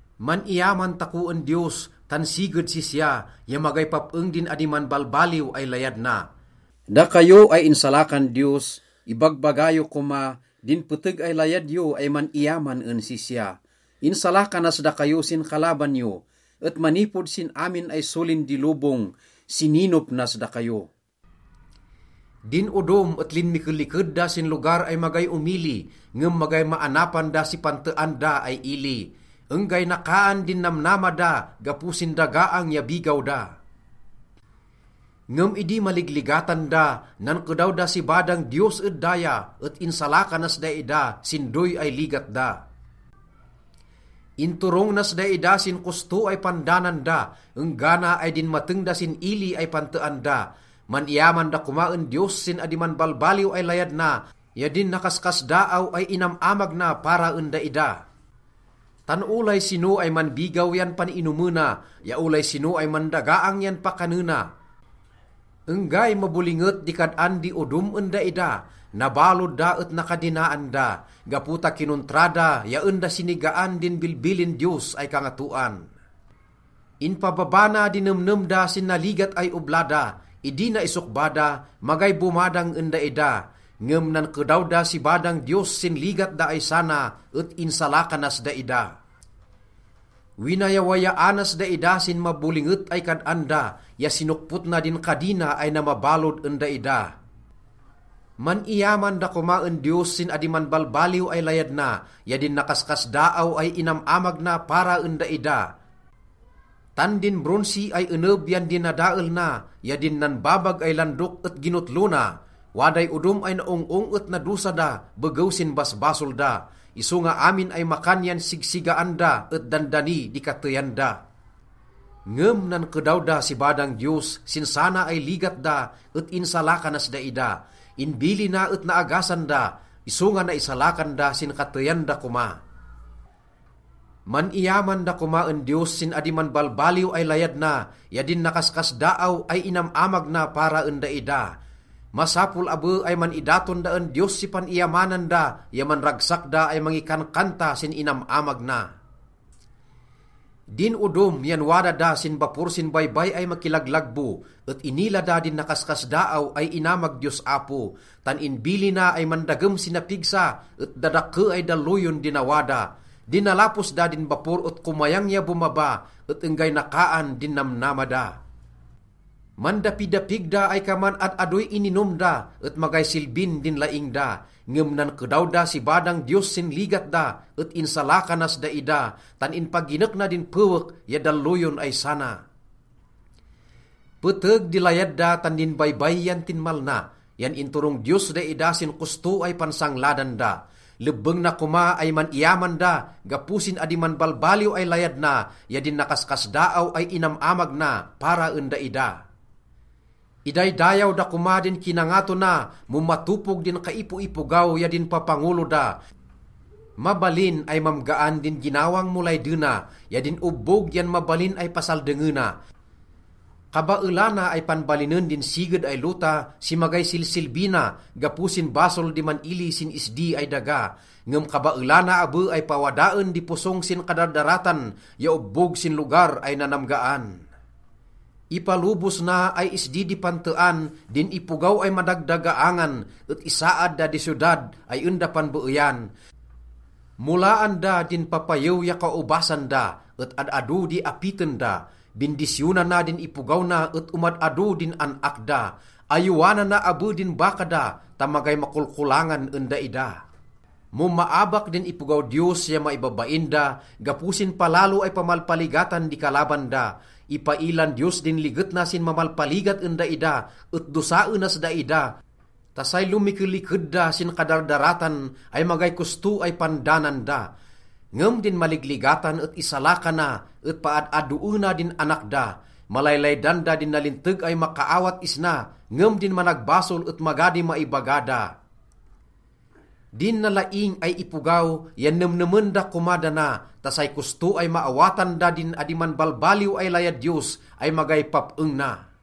Man-iyaman tako en Diyos tan siged sisya, ya magay pap-eng din adi manbalbaliw ay layad na. Dakayo ay insalakan Diyos, ibagbaga yo koma din peteg ay layad yo ay man-iyaman en sisya. Insalakanas dakayo sin kalaban yo et manipod sin amin ay solin di lobong, sininop nas dakayo. Din odom et linmikeliked da sin lugar ay magay omili, ngem magay maanapan da si pantean da ay ili. Enggay nakaan din namnama da gapo sin dagaang ya bigaw da. Ngem idi maligligatan da, nankedaw da si badang Diyos ed daya, et insalakanas daida sin doy ay ligat da. Inturong nas daida sin kosto ay pandanan da enggana ay dinmateng da sin ili ay pantean da. Man-iyaman da koma en Diyos sin adi manbalbaliw ay layad na ya din nakaskasdaaw ay inam-amag na para en daida. Tan olay sino ay manbigaw yan pan-inomena, ya olay sino ay mandagaang yan pakanena. Enggay mabolinget di kad-an di odom en daida, nabalod da et nakadinaan da, gapo ta kinontra da ya en da sinigaan din bilbilin Diyos ay Kangatoan. Inpababa na di nemnem da sin naligat ay obla da. Idi naisokba da, magay bomadang en daida. Ngem nankedaw da si badang Diyos sin ligat da ay sana et insalakanas daida. Winayawayaanas daida sin mabolinget ay kad-an da, ya sinokpot na din kadina ay namabalod en daida. Man-iyaman da koma en Diyos sin adi manbalbaliw ay layad na, ya din nakaskasdaaw ay inam-amag na para en daida. Tan din bronsi ay eneb yan dinadael na ya din nanbabag ay landok et ginotlo na. Waday odom ay naong-ong et nadosa da begew sin basbasol da. Isonga amin ay makan yan sigsigaan da et dandani di kateyan da. Ngem nankedaw da si badang Diyos sin sana ay ligat da et insalakanas daida. Inbilina et naagasan da, isonga naisalakan da sin kateyan da koma. Man-iyaman da koma en Diyos sin adi manbalbaliw ay layad na, ya din nakaskasdaaw ay inam-amag na para en daida. Masapol abe ay man-idaton da en Diyos si pan-iyamanan da ya manragsak da ay mangikankanta sin inam-amag na. Din odom yan wada da sin bapor sin baybay ay makilaglagbo, et inila da din nakaskasdaaw ay inamag Diyos Apo. Tan inbilina ay mandagem si napigsa, et dadakke ay dalloyon di nawada. Dinalapos da din bapor et komayang ya bomaba, et enggay nakaan din namnama da. Mandapidapig da ay kaman ad-adoy ininom da, et magay silbin din laing da. Ngem nankedaw da si badang Diyos sin ligat da et insalakanas daida, tan inpaginek na din pewek ya dalloyon ay sana. Peteg di layad da tan din baybay yan tinmalna, yan inturong Diyos daida sin kosto ay pansangladan da. Lebbeng na koma ay man-iyaman da gapo sin adi manbalbaliw ay layad na, ya din nakaskasdaaw ay inam-amag na para en daida. Idaydayaw da koma din kinangato na mo matopog din kaipoipogaw ya din papangolo da. Mabalin ay mamgaan din ginawang mo laydena, ya din obbog yan mabalin ay pasaldengena. Kabaelana ay panbalinen din siged ay lota si magay silsilbi na gapo sin basol di man-ili sin isdi ay daga. Ngem kabaelana abe ay pawadaen di posong sin kadardaratan ya obbog sin lugar ay nanamgaan. Ipalobos na ay isdi di pantean din ipogaw ay madagdagaangan, et isaad da di siyodad ay en da panbeeyan. Molaan da din papayew ya kaobasan da, et ad-ado di apiten da. Bindisyonana din ipogaw na et omad-ado din an-ak da. Ayowanana abe din baka da ta magay makolkolangan en daida. Mo maabak din ipogaw Diyos ya maibabain da gapo sin palalo ay pamalpaligatan di kalaban da, ipailan Diyos din liget na sin mamalpaligat en daida et dosaenas daida ta say lomikeliked da sin kadardaratan ay magay kosto ay pandanan da. Ngem din maligligatan et isalakana, et paad-adoena din anak da. Malaylaydan da din nalinteg ay makaawat isna, ngem din managbasol et maga di maibaga da. Din nalaing ay ipogaw yan nemnemen da koma dana, ta say kosto ay maawatan da din adi manbalbaliw ay layad Diyos ay magay pap-eng na.